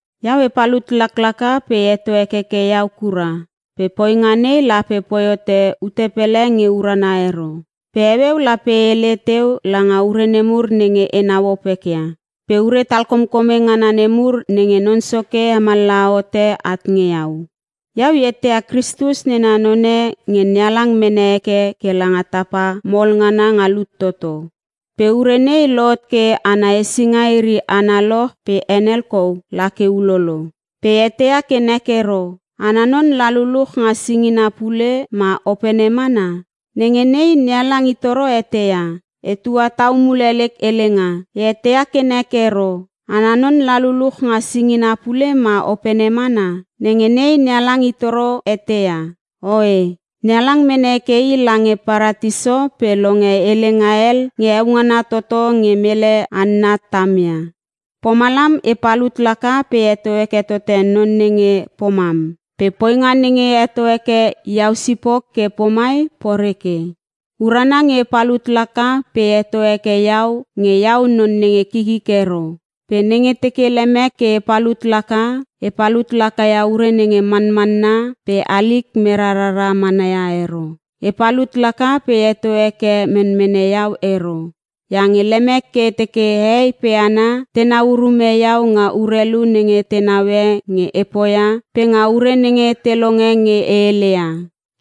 Iau e palut laklaka pe e heto hekeke iau kura pe poinga nei lape poi hote ute pele nge urana ero. Pe heueu lape e hele teu langa ure nemur nenge enau opekia, pe ure talkomkome ngana nemur nenge Non Soke hemallaha hote at nge iau. Iau e eteia Kristus nena none nge NeHalang mene heke ke langa tapa mol ngana nga lut toto. Pe ure nei lohot ke ana hesinga iri analoch pe henel kou la ke ulolo. Pe e eteia ke nek ero, ana non la luluch nga singina pule ma opene mana? Nenge nei NeHalang i toro eteia. Etua tau mule lek helenga: E eteia ke nek ero, ana non la luluch nga singina pule ma opene mana? Nenge nei NeHalang i toro eteia. Oe! NeHalang mene heke i lange Paratiso pe longe helenga hel nge heo ngana toto nge mele hanna tamia. Pomalam e palut laka pe e heto heke tote none nenge pomam. Pe poinga nenge e heto heke iau sipok ke pomai poreke. Urana nge e palut laka pe e heto heke iau nge iau non nenge kikik ero. Pe nenge teke lemek ke e palut laka, e palut laka ia ure nenge manmanna pe halik mera rara mana ero. E palut laka pe e heto heke menmene iau ero, iange lemek ke e teke hehei pe hana tenau urume iau nga urelu nenge te naue nge e poia pe nga ure nenge te longe nge e heleia.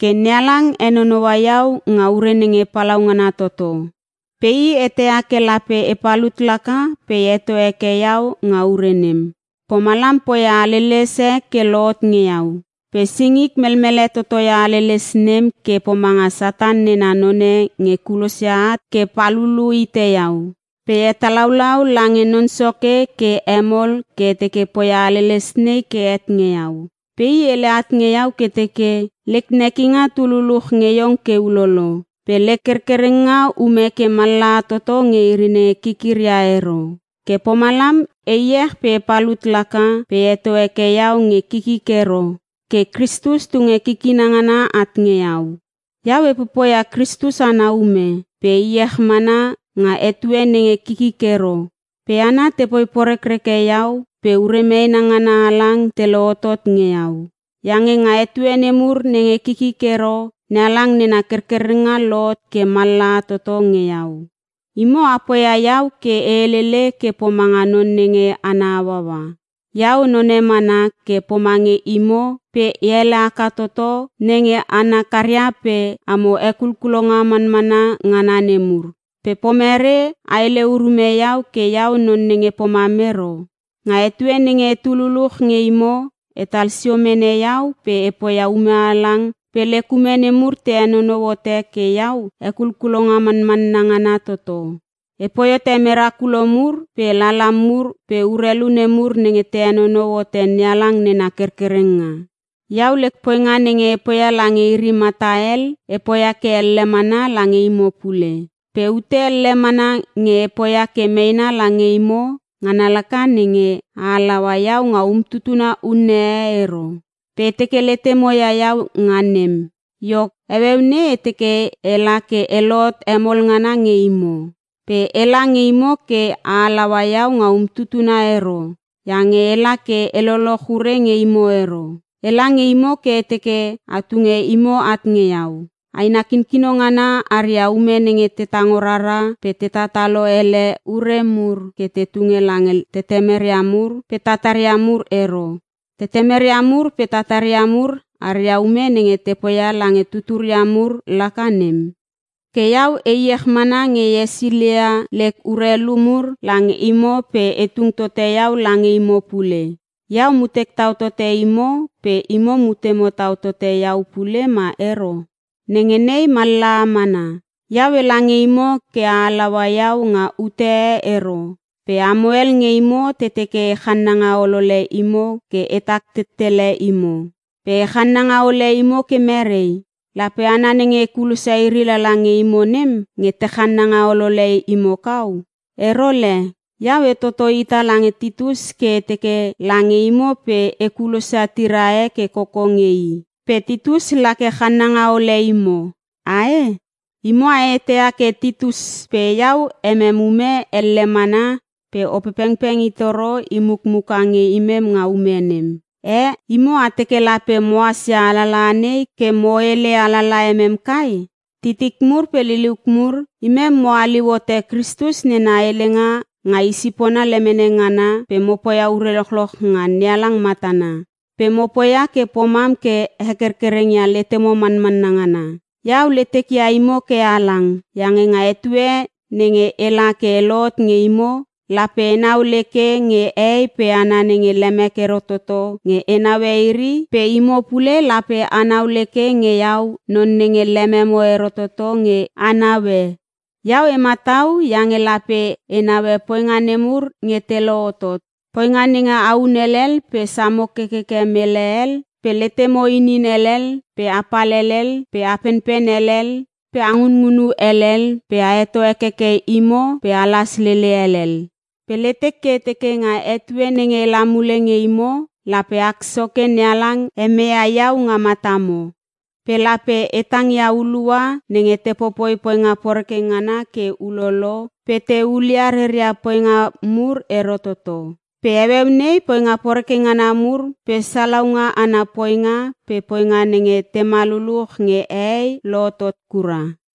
Ke NeHalang henonoua iau nga ure nenge palaungana toto. Pe i eteia ke lape e palut laka pe e heto heke iau nga ure nem. Pomalam poia haleles e ke lohot nge iau. Pe singik melmele toto ia haleles nem ke pomanga Satan nena none nge kulosia at ke palulu hite iau. Pe e hetalaulau lange Non Soke ke hemol ke e teke poia haleles nei ke het nge iau. Pe i hele at nge iau ke teke, “Lek nekinga tu luluch nge iong ke ulolo. Pe lek kerkerenga ume ke mallaha toto nge iri nenge kikiria ero.” Ke pomalam e iech pe e palut laka pe e heto heke iau nge kikik ero, ke Kristus tunge kikina ngana at nge iau. Iau e popoia Kristus ana ume pe e iech mana nga etue nenge kikik ero, pe hana te poi porekreke iau pe ure meena ngana halang te lohotot nge iau. Iange nga etue nemur nenge kikik ero, NeHalang nena kerkerenga lohot ke mallaha toto nge iau. Imo a poia iau ke e helele ke pomanga none nge ana hauaua. Iau none mana ke pomange imo pe e ele haka toto nge hana nenge hana karia pe “amo hekulkulonga manmanna ngana nemur” pe pomerei a hele urume iau ke iau non nenge pomam ero?! Nga etue nenge etu luluch nge imo etal sio mene iau pe e poia ume halang pe lek ume nemur te henonou hote ke iau hekulkulonga manmanna ngana toto. Epoi hote merakulo mur pe lala mur pe urelu nemur nenge te henonou hote NeHalang nena kerkerenga. Iau lek poinga nenge e poia lange iri mata hel e poia ke elle mana lange imo pule. Pe ute elle mana nge e poia ke meena lange imo ngana laka nenge, a halaua iau nga umtutuna unne e ero. Pe e teke letemo ia iau nga nem. Iok, heueu nei e teke ela ke e lohot hemol ngana nge imo. Pe ela nge imo ke a halaua iau nga umtutuna ero iange ela ke e loloch ure nge imo ero. Ela nge imo ke e teke a tunge imo at nge iau. Aina kinkino ngana aria ume nenge te tango rara pe te tatalo ele ure mur ke te tunge lange tetemeria mur pe tataria mur ero. Tetemeria mur pe tataria mur aria ume nenge te poia lange tuturia mur laka nem. Ke iau e iech mana nge e hesilia lek urelu mur lange imo pe e tung tote iau lange imo pule. Iau mutek tau tote imo pe imo mutemo tau tote iau pule ma ero? Nenge nei mallaha mana. Iau ela nge imo ke a halaua iau nga ute e ero pe amo hel nge imo te teke e channanga olole imo ke etak tettele imo. Pe e channanga ole imo ke merei? Lape hana nenge e kulosia iri lala nge imo nem, nge te channanga olole imo kau? Ero le! Iau e toto hita lange Titus ke e teke lange imo pe e kulosia tira e ke koko nge i. Pe Titus la ke channanga ole imo, ae? Imo a eteia ke Titus pe iau emem ume elle mana pe Opepengpeng itoro i mukmuka nge imem nga ume nem. Eh, imo a teke lape mohas ia alalaha nei ke mo hele alala emem kai? Titik mur pe liliuk mur, imem mo haliu hote Kristus nena helenga nga i sipona lemene ngana pe mo poia ure lochloch nga NeHalang matana. Pe mo poia ke pomam ke hekerkereng ia letemo manmanna ngana. Iau letek ia imo ke halang iange nga etue nenge ela ke e lohot nge imo, lape enau leke nge hehei pe hana nenge lemek ero toto nge e naue iri pe imo pule lape anau leke nge iau non nenge lememo ero toto nge a naue. Iau e matau iange lape e naue poinga nemur nge te lohotot: Poinga nenge ahun helel pe samo kekeke mele hel pe letemo inin helel pe apal helel pe a penpen helel pe a ngunngunu helel pe a heto hekeke imo pe alas lele helel. Pe letek ke e teke nga etue nenge ela mule nge imo, lape ak Soke NeHalang hemeia iau nga matamo. Pe lape e tang ia hulua nenge te poipoi poinga poreke ngana ke ulolo pe te hulia reria poinga mur ero toto. Pe heueu nei poinga poreke ngana mur pe salaunga ana poinga pe poinga nenge tema lululuch nge hehei lohotot kura.